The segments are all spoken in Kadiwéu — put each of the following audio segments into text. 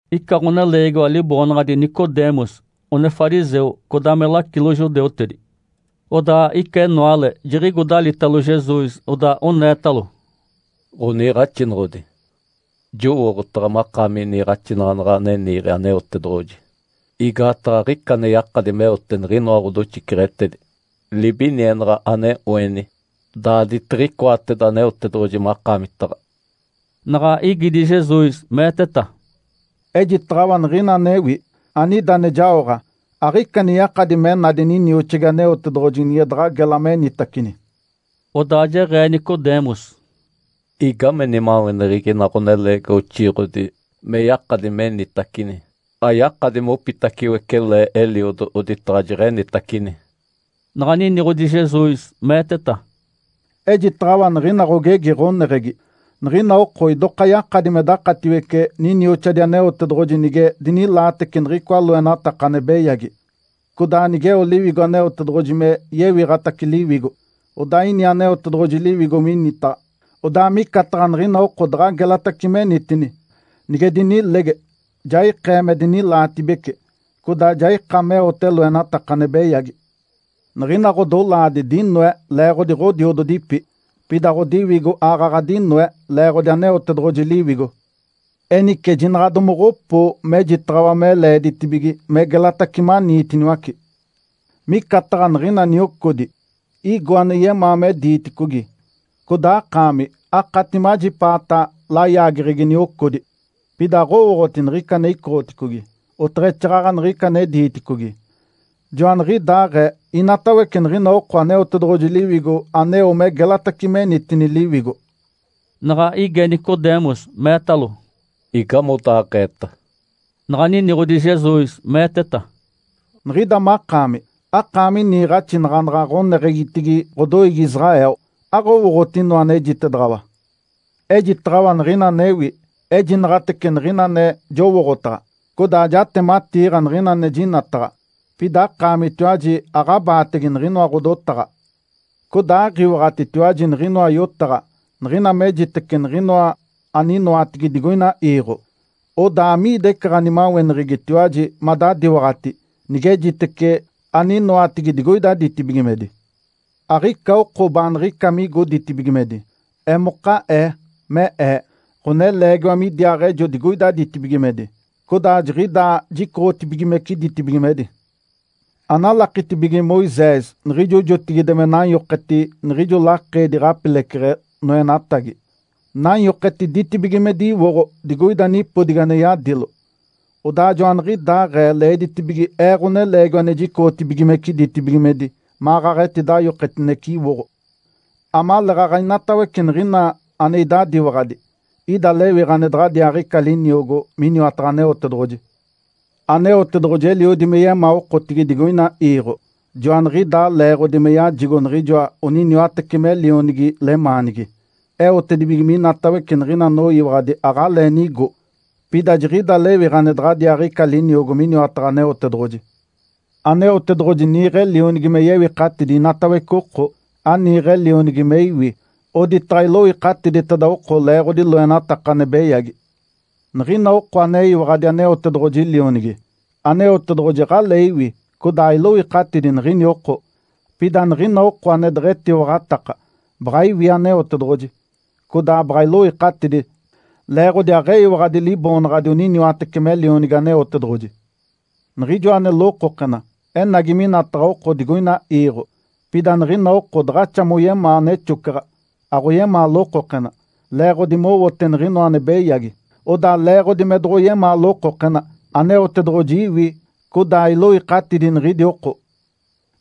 Ica ɡ̶oneleegiwa liboonaɡ̶adi Nicodemus, one fariseu, codaa me lacilo judeutedi. Odaa ica enoale, jiɡ̶igo dalitalo Jesus, odaa oneetalo, “Ǥoniiɡ̶axinoɡ̶odi. Jowooɡ̶otaɡ̶a makaami niiɡ̶axinaɡ̶anaɡ̶a ane niiɡ̶e Aneotedoɡ̶oji, igaataɡ̶a aɡ̶ica ane yakadi meote niɡ̶inoa ɡ̶odoxiceɡ̶etedi libinienaɡ̶a ane oeni, daaditiɡ̶icoateda Aneotedoɡ̶oji makaamitaɡ̶a”. Naɡ̶a igidi Jesus, meeteta, “Ejitaɡ̶awa niɡ̶ina anewi, anida ane jaoɡ̶a. Aɡ̶ica ane yakadi me nadi ninioxigi Aneotedoɡ̶oji nige daɡ̶a gela menitacini.” Odaa jeɡ̶ee Nicodemus, “Igame nimaweneɡ̶egi ina ɡ̶oneleegiwa oxiiɡ̶odi me yakadi menitacini? Ayakadi mopitaciwece le eliodo oditaɡ̶a jeɡ̶enitacini.” Naɡ̶a niniɡ̶odi Jesus, meeteta, “Ejitaɡ̶awa niɡ̶ina ɡ̶ogegi ɡ̶oneɡ̶egi. Niɡ̶ina oko idoka yakadi me dakatiwece ninioxadi Aneotedoɡ̶oji nige dinilaatece niɡ̶icoa loenataka ane beyagi, codaa nigeo Liwigo Aneotedoɡ̶oji me yewiɡ̶atace liwigo. Odaa ini Aneotedoɡ̶oji Liwigo minitaɡ̶a, odaa micataɡ̶a niɡ̶ina oko daɡ̶a gelatace menitini. Nige dinilege, ja ikee me dinilaatibece, codaa ja ika meote loenataka ane beyagi. Niɡ̶ina ɡ̶odolaadi dinoe leeɡ̶odi ɡ̶odiododipi. Pida ɡ̶odiwigo aaɡ̶aɡ̶a dinoe leeɡ̶odi Aneotedoɡ̶oji Liwigo. Enice jinaɡ̶a domoɡ̶opoo mejitaɡ̶awa me leeditibige me gelatace maniitiniwace. Micataɡ̶a niɡ̶ina niocodi. Igo ane yemaa me diiticogi, codaa akaami akati majipaata layaageɡ̶egi niocodi. Pida aɡ̶owooɡ̶oti niɡ̶ica ane icoɡ̶oticogi, oteɡ̶exaaɡ̶aɡ̶a niɡ̶ica ane diiticogi. Joaniɡ̶idaaɡ̶ee inatawece niɡ̶ina oko Aneotedoɡ̶oji Liwigo aneo me gelatace menitini liwigo”. Naɡ̶a ige Nicodemus meetalo, “Igamodaaɡ̶eeta?” Naɡ̶a niniɡ̶odi Jesus, meeteta, “Niɡ̶ida makaami akaami niiɡ̶axinaɡ̶anaɡ̶a ɡ̶oneɡ̶egitigi ɡ̶odoiigi Israel. Aɡ̶owooɡ̶oti inoa anejitedaɡ̶awa? Ejitaɡ̶awa niɡ̶ina anewi. Ejinaɡ̶atece niɡ̶ina ane jowooɡ̶otaɡ̶a. Codaa jatematiiɡ̶a niɡ̶ina ane jinataɡ̶a. Pida akaamitiwaji aɡ̶abaatege niɡ̶inoa ɡ̶odotaɡ̶a. Codaa aɡ̶iwaɡ̶atitetiwaji niɡ̶inoa yotaɡ̶a niɡ̶ina mejitece niɡ̶inoa aninoatigi digoina iiɡ̶o. Odaa amiida ica ɡ̶animaweneɡ̶egitiwaji madadiwaɡ̶ati nigejitece aninoatigi digoida ditibigimedi? Aɡ̶ica oko baaniɡ̶ica migo ditibigimedi. Emoka Ee, me Ee, Ǥoneleegiwa midiaaɡ̶ejo digoida ditibigimedi, codaa jiɡ̶idaa jicoɡ̶otibigimece ditibigimedi. Analakitibige Moisés niɡ̶ijo jotigide me nanyoketi niɡ̶ijo lakeedi ɡ̶apileceɡ̶e noenatagi, nanyoketi ditibigimedi iwoɡ̶o digoida nipodigi ane yadilo. Odaa joaniɡ̶idaaɡ̶ee leeditibige Ee, Ǥoneleegiwa ane jicoɡ̶otibigimece ditibigimedi, maɡ̶aɡ̶a etidayoketinece iwoɡ̶o. Amaleeɡ̶aɡ̶a inatawece niɡ̶ina ane idadiwaɡ̶adi, ida lewiɡ̶a ane daɡ̶adiaaɡ̶ica liniogo miniwataɡ̶a Aneotedoɡ̶oji. Aneotedoɡ̶oji eliodi me yemaa okotigi digoina iiɡ̶o, joaniɡ̶idaa leeɡ̶odi me yajigo niɡ̶ijoa oniniwatece me Lionigi lemaanigi, eotedibige minatawece niɡ̶ina anoyiwaɡ̶adi aɡ̶alee nigo, pida jiɡ̶ida lewiɡ̶a ane daɡ̶adiaaɡ̶ica liniogo miniwataɡ̶a Aneotedoɡ̶oji. Aneotedoɡ̶oji niiɡ̶e Lionigi me yewikatidi inatawece oko. Aniiɡ̶e Lionigi me iwi, oditaɡ̶a iloikatiditeda oko leeɡ̶odi loenataka ane beyagi. Niɡ̶ina oko aneyiwaɡ̶adi Aneotedoɡ̶oji Lionigi, Aneotedoɡ̶oji aɡ̶alee iwi codaa ailoikatidi niɡ̶ini oko. Pida niɡ̶ina oko ane deɡ̶etiwaɡ̶ataka, baɡ̶a iwi Aneotedoɡ̶oji, codaa baɡ̶a iloikatidi, leeɡ̶odi aɡ̶eyiwaɡ̶adi Liboonaɡ̶adi oniniwatece me Lionigi Aneotedoɡ̶oji. Niɡ̶ijoa ane lokokena enagi minataɡ̶a oko digoina iiɡ̶o. Pida niɡ̶ina oko daɡ̶axa moyemaa nexocaɡ̶a, aɡ̶oyemaa lokokena, leeɡ̶odi mowote niɡ̶inoa ane beyagi. Odaa leeɡ̶odi me doɡ̶oyemaa lokokena, Aneotedoɡ̶oji iwi, codaa iloikatidi niɡ̶idi oko.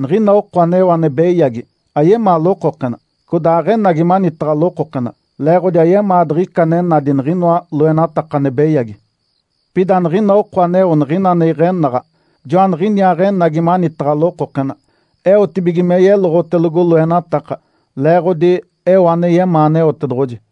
Niɡ̶ina oko aneo ane beyagi, ayemaa lokokena. Codaa aɡ̶enagi manitaɡ̶a lokokena, leeɡ̶odi ayemaa diɡ̶ica ane nadi niɡ̶inoa loenataka ane beyagi. Pida niɡ̶ina oko aneo niɡ̶ina ane iɡ̶enaɡ̶a, joaniɡ̶iniaaɡ̶enagi manitaɡ̶a lokokena eotibige me yeloɡ̶otelogo loenataka, leeɡ̶odi eo ane yemaa Aneotedoɡ̶oji”.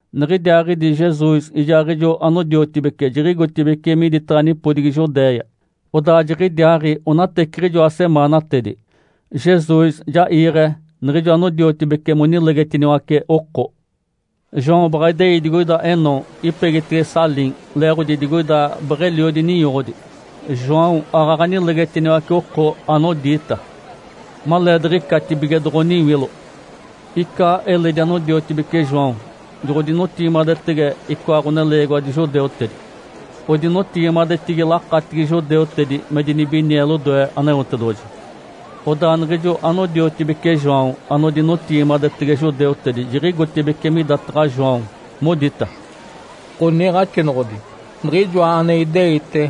Niɡ̶idiaaɡ̶idi Jesus ijaaɡ̶ijo anodiotibece jiɡ̶igotibeci miditaɡ̶a nipodigi Judéia. Odaa jiɡ̶idiaaɡ̶i onateciɡ̶ijoa semaanatedi, Jesus ja iiɡ̶e niɡ̶ijo anodiotibece monilegetiniwace oko. João baɡ̶a idei digoida Enom, ipegitege Salim, leeɡ̶odi digoida beɡ̶eliodi ninyoɡ̶odi. João aaɡ̶aɡ̶a nilegetiniwace oko anodiita. Maleediɡ̶icatibige doɡ̶oniwilo. Ica eledi anodiotibeci João joɡ̶odinotigimadetege icoa ɡ̶oneleegiwadi judeutedi. Odinotigimadetigi lakatigi judeutedi me dinibinie lodoe Aneotedoɡ̶oji. Odaa niɡ̶ijo anodiotibeci João anodinotigimadetege judeutedi jiɡ̶igotibeci midataɡ̶a João, modita, “Ǥoniiɡ̶axinoɡ̶odi. Niɡ̶ijoa ane ideite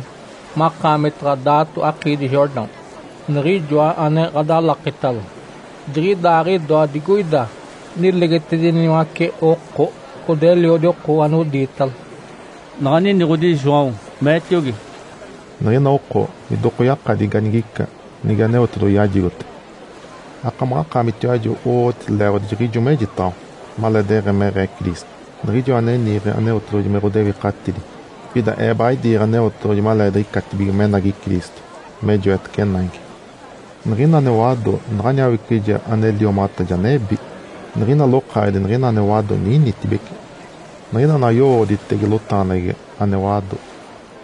makaamitaɡ̶a daato akiidi Jordão, niɡ̶ijoa ane ɡ̶adalakitalo, jiɡ̶idaaɡ̶idoa digoida nilegetediniwace oko, codaa eliodi oko anodiitalo”. Naɡ̶a niniɡ̶odi João, meetiogi, “Niɡ̶ina oko idoka yakadi ganigica nige Aneotedoɡ̶oji yajigote. Akamaɡ̶akaamitiwaji owooɡ̶oti leeɡ̶odi jiɡ̶ijo mejitaɡ̶awa, ‘Maleedeɡ̶emeɡ̶ee Cristo, Niɡ̶ijoa ane niiɡ̶e Aneotedoɡ̶oji me ɡ̶odewikatidi. Pida ee baɡ̶a idiiɡ̶e Aneotedoɡ̶oji maleediɡ̶icatibige menagi Cristo me joetece naigi’. Niɡ̶ina ane wado, naɡ̶ani awicije ane liomaɡ̶ata, ja nebi. Niɡ̶ina lokaaɡ̶edi niɡ̶ina ane wado ninitibece niɡ̶ina naɡ̶a yowooɡ̶oditege lotaɡ̶aneɡ̶egi ane wado.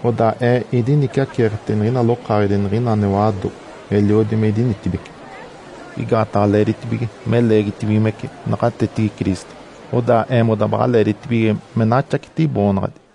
Odaa ee idiniciaceeketege niɡ̶ina lokaaɡ̶edi niɡ̶ina ane wado, eliodi me idinitibeci. Igaataɡ̶a leeditibige me leegitibigimece naɡ̶atetigi Cristo, odaa eemoda baɡ̶a leeditibige me naxaceti iboonaɡ̶adi”.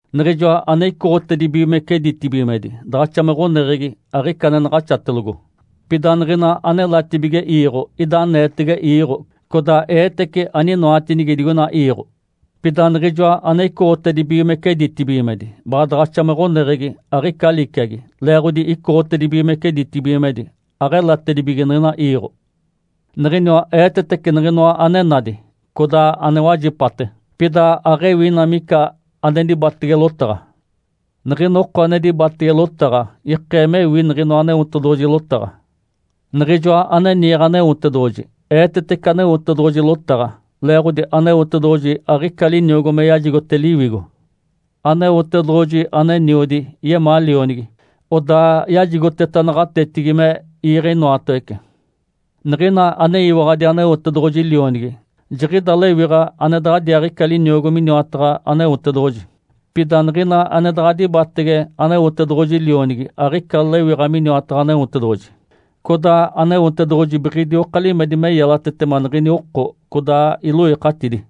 Niɡ̶ijoa ane icoɡ̶otedibigimece ditibigimedi daɡ̶axa me ɡ̶oneɡ̶egi, aɡ̶ica ane naɡ̶axatelogo. Pida niɡ̶ina anelatibige iiɡ̶o, ida aneetege iiɡ̶o, codaa eetece aninoatinigi digoina iiɡ̶o. Pida Niɡ̶ijoa ane icoɡ̶otedibigimece ditibigimedi baɡ̶a daɡ̶axa me ɡ̶oneɡ̶egi, aɡ̶ica liciagi, leeɡ̶odi icoɡ̶otedibigimece ditibigimedi, aɡ̶elatedibige niɡ̶ina iiɡ̶o. Niɡ̶iniwa eetetece niɡ̶inoa ane nadi, codaa ane wajipate. Pida aɡ̶ewi ina mica ane dibatege lotaɡ̶a. Niɡ̶ina oko ane dibatege lotaɡ̶a ikee mewi niɡ̶inoa Aneotedoɡ̶oji lotaɡ̶a. Niɡ̶ijoa ane niiɡ̶e Aneotedoɡ̶oji, eetetece Aneotedoɡ̶oji lotaɡ̶a, leeɡ̶odi Aneotedoɡ̶oji aɡ̶ica liniogo me yajigote Liwigo. Aneotedoɡ̶oji, ane Eniodi, yemaa Lionigi. Odaa yajigoteta naɡ̶atetigi me iiɡ̶e inoatawece. Niɡ̶ina aneyiwaɡ̶adi Aneotedoɡ̶oji Lionigi jiɡ̶ida lewiɡ̶a ane daɡ̶adiaaɡ̶ica liniogo miniwataɡ̶a Aneotedoɡ̶oji. Pida niɡ̶ina ane daɡ̶a dibatege Aneotedoɡ̶oji Lionigi aɡ̶ica lewiɡ̶a miniwataɡ̶a Aneotedoɡ̶oji, codaa Aneotedoɡ̶oji biɡ̶idioka limedi me yelatetema niɡ̶ini oko, codaa iloikatidi.